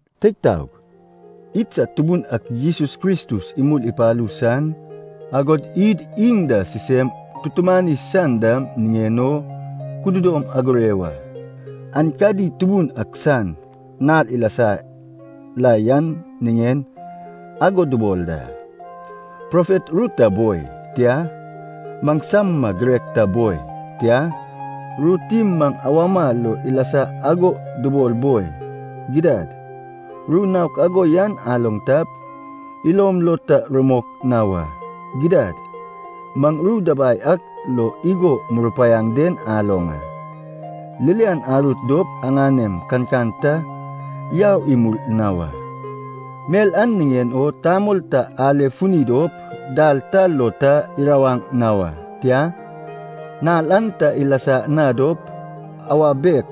Teig taog, idsad Tubun ak Jesus Kristus imul ipalu san, agod id iŋ da sisem tutumani san dam niŋen o kudodom agure wa. Aenkadi Tubun ak san Nal ilasa la yan niŋen ago dubol da. Profet ru ta boi, tia, maŋsama girek ta boi, tia, ru tim maŋ awama lo ilasa ago dubol boi, gidad, ru naok ago yan aloŋ tap, ilom lo ta rumok na wa. Gidad, maŋ ru dabai ak lo igo murupaiaŋ den aloŋ a, ririan arut dop aŋanem kankan ta yau imul na wa. Mel an niŋen o tamol ta ale funi dop dal ta lo ta irawaŋ na wa. Tia, nal an ta ilasa na dop, awa bitek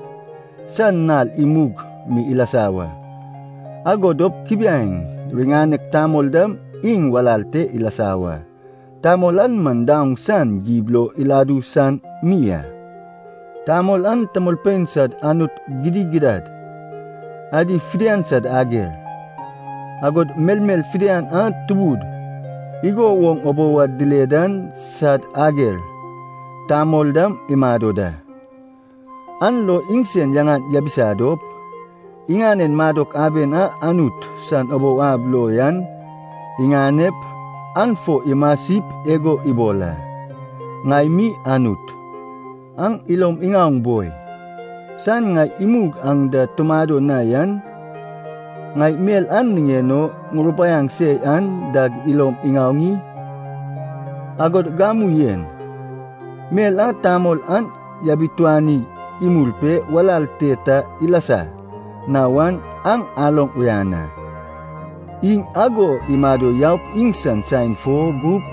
san nal imug mi ilasa wa, ago dop kubiaeŋ riŋanek tamol dam iŋ walal te ilasa wa. Tamol an man daoŋ san gib lo idu san mi a. Tamol an tamolpein sad anut gidigidad adi fidian sad ager, agod melmel fidian a tubud igo woŋ ubou ad dile dan sad ager tamol dam imado da. An lo iŋsen yaŋan yabisa dop, iŋanen madok aben a Anut san ubou ab lo yan iŋanep, an fo imasip igo ibol a, “ŋai mi Anut.” Aŋ ilom iŋaoŋ boi, saen ŋai imug aŋ da tumado na yan, ŋai mel a niŋen o ŋurupaiaŋ se yan dag ilom iŋaoŋ i? Agod gamu en, mel a tamol an yabituani imul pe walal te ta ilasa na wan aŋ aloŋ uyan a. Iŋ ago imado yaup iŋsan saen fo gup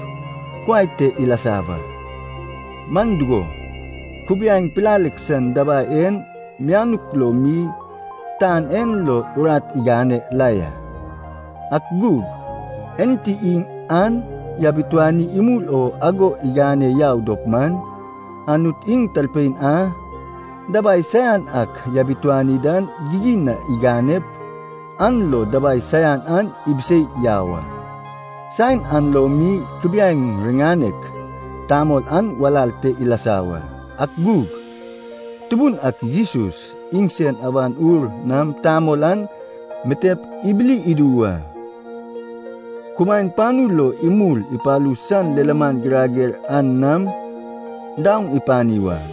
kuai te ilasa wa. Man dugo, kubiaeŋ pilalek san dabai en mianuk lo mi tan en lo urat igane la ya. Ak gug, enti iŋ an yabituani imul o ago igane yau dop man, Anut iŋ talpein a dabai saian ak yabituani dan gigin na iganep, an lo dabai saian an ibisei yau a. Saen an lo mi kubiaeŋ riŋanek tamol an walal te ilasa wa. Ak gug, Tubun ak Jesus iŋsan Awan Ur nam tamol an mitep ibili idu wa, kumaen panu lo imul ipalu san lilaman girager an nam, daoŋ ipani wa.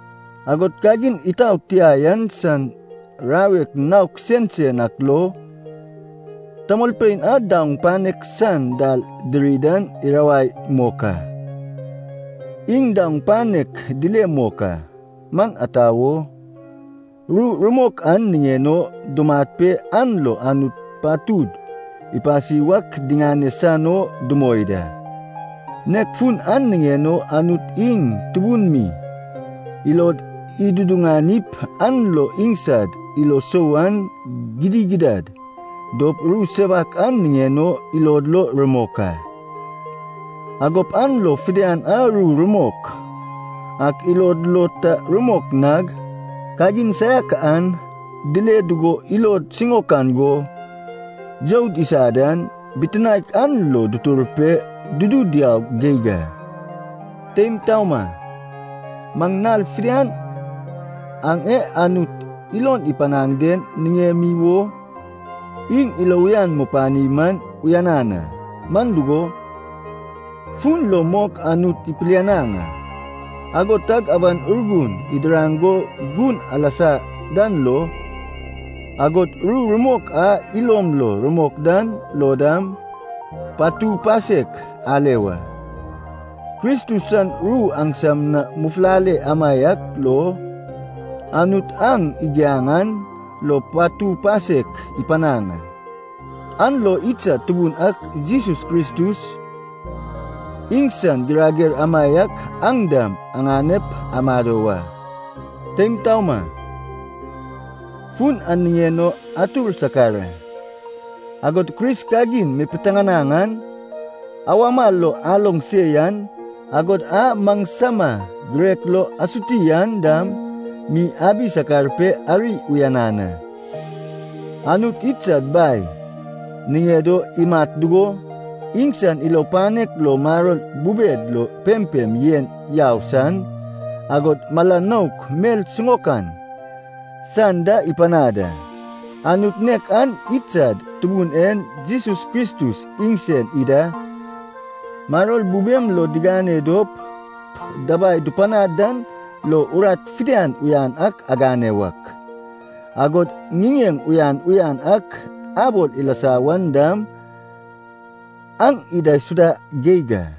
Agod kagin itaot tia yan san rawek naok sensen ak lo, tamolpein a daoŋ panek san dal diri dan irawai mok a. Iŋ daoŋ panek dile mok a, man ata wo, ru rumok an niŋen o dumat pe an lo Anut patud ipasi wak diŋane san o dumoi da. Nek fun an niŋen o Anut iŋ tubun mi ilod iduduŋanip an lo iŋsad ilo sou an gidigidad dop Ru Sewak an niŋen o ilod lo rumok a. Agop an lo fidian a ru rumok ak ilod lo ta rumok nag, kagin saiak an dile dugo ilod siŋaokan go youd isa dan, bitinaek an lo dutur pe dudu diau geig a. Teim taoma, maŋ nal fidian aŋ e Anut ilon ipanaŋ den niŋemi wo iŋ ilo uyan mupani man uyanan a. Man dugo, fun lo mok Anut ipilianaŋ a, ago tag Awan Urgun idiraŋ go gun alasa dan lo, agod ru rumok a ilom lo rumok dan lo dam, patu pasek ale wa. Kristus san ru aŋsam na mufulale amaiak lo, Anut aŋ igiaŋ an lo patu pasek ipanaŋ a. An lo idsad Tubun ak Jesus Kristus iŋsan girager amaiak aŋ dam aŋanep amado wa. Teim taoma, fun an niŋen o atur sakar a. Agod Kris kagin mipiteŋanaŋ an, awama lo aloŋ se yan, agod a maŋsama girek lo asuti an dam mi abi sakar pe ari uyanan a. Anut idsad Bai niŋed o imat dugo, iŋsan ilo panek lo maror bubed lo pempem yen yau san, agod mala nouk mel siŋaokan san da ipanad a. Anut nek an idsad Tubun en Jesus Kristus iŋsen ida maror bubem lo digane dop, dabai dupanaŋ dan lo urat fidian uyan ak agane wak, agod ŋiŋeŋ uyan uyan ak abol ilasa wan dam, aŋ idaisuda geig a.